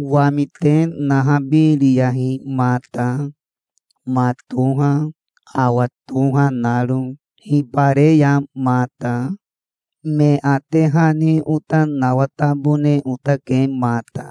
"Wami te nahabiriyahi mata, ma toha, awa toha naro. Hibareya mata. Me ate hani ota nawatabone otake mata,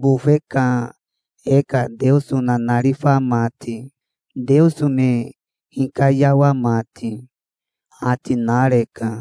bofe ka e ka Teoso nanarifa mati, Teoso me hikayawa mati", ati nareka.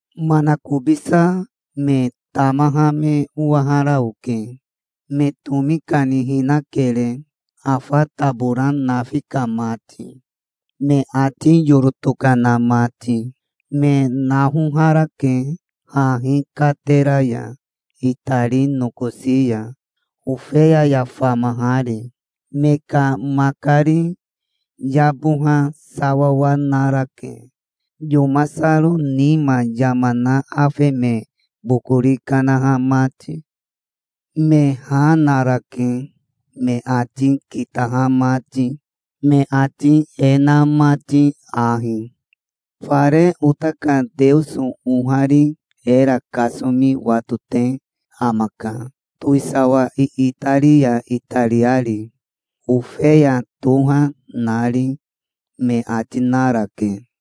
Manakobisa me tamaha me owahara oke. Me tomi kani hinakere, afa tabora nafi ka mati, me ati yoro tokana mati. Me naoharake, hahi katera ya itari nokosi ya, Ofeya ya famahari. Me ka makari yaboha sawawa narake, yomasaro nima yama na afe me bokori kanaha mati. Me ha narake me ati kitaha mati, me ati e na mati ahi: "Fare ota ka Teoso ohari era kasomi watote amaka, towisawa iitari ya itariari, Ofeya toha nari", me ati narake.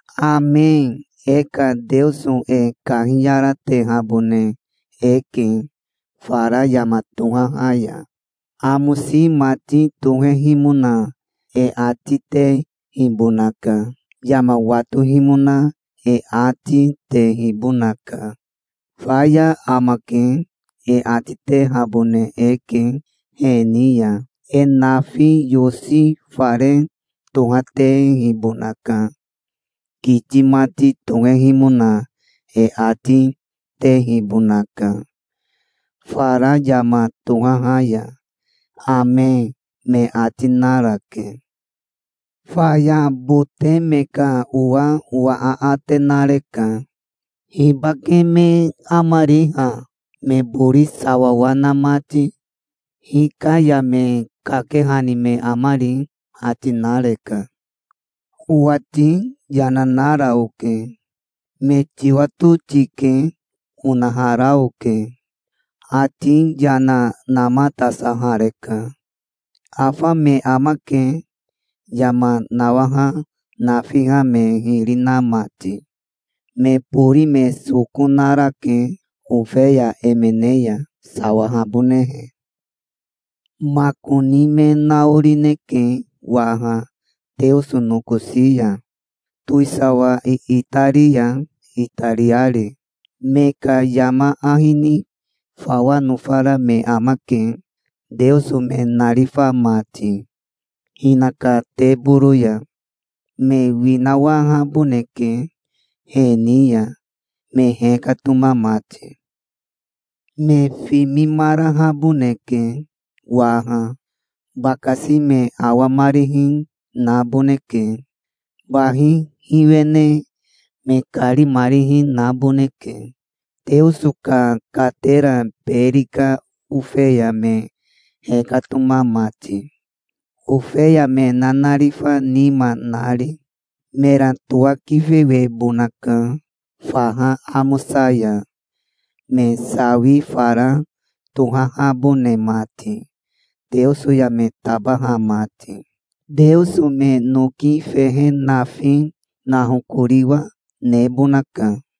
"Ame. E ka Teoso e kahiyaratehabone eke fara yama tohaha ya. Amosi mati tohehimona e ati tehibonaka. Yama watohimona e ati tehibonaka. 'Faya amake', e ati tehabone eke he ni ya. E nafi yosi fare tohatehibonaka. Kiti mati tohehimona e ati tehibonaka fara yama tohaha ya. Ame", me ati narake. Faya bote me ka owa owa aate nareka. "Hibake me amari ha, me bori sawawa na mati? Hika ya me kakehani me amari?" ati nareka. Owati yana nara oke. "Me tiwato tike", onahara oke. Ati yana namatasahareka. "Afa me amake, yama nawaha nafiha me hiri na mati. Me bori me soko narake Ofeya emene ya, sawahabonehe. Makoni me naorineke waha Teoso nokosi ya, towisawa iitari ya itariari. Me ka yama ahi ni fawa nofara me amake, Teoso me narifa mati, hinaka teboro ya. Me winawahaboneke he ni ya, me hekatoma mati. Me fimimarahaboneke waha. Bakasi me awamarihi naboneke. Bahi hiwene me karimarihi naboneke, Teoso ka katera beri ka Ofeya me hekatoma mati, ofeya me nanarifa nima nari. Mera towakifewebonaka faha amosa ya, me sawi fara tohahabone mati Teoso ya me tabaha mati. Teoso me noki fehe nafi nahokoriwa nebonaka".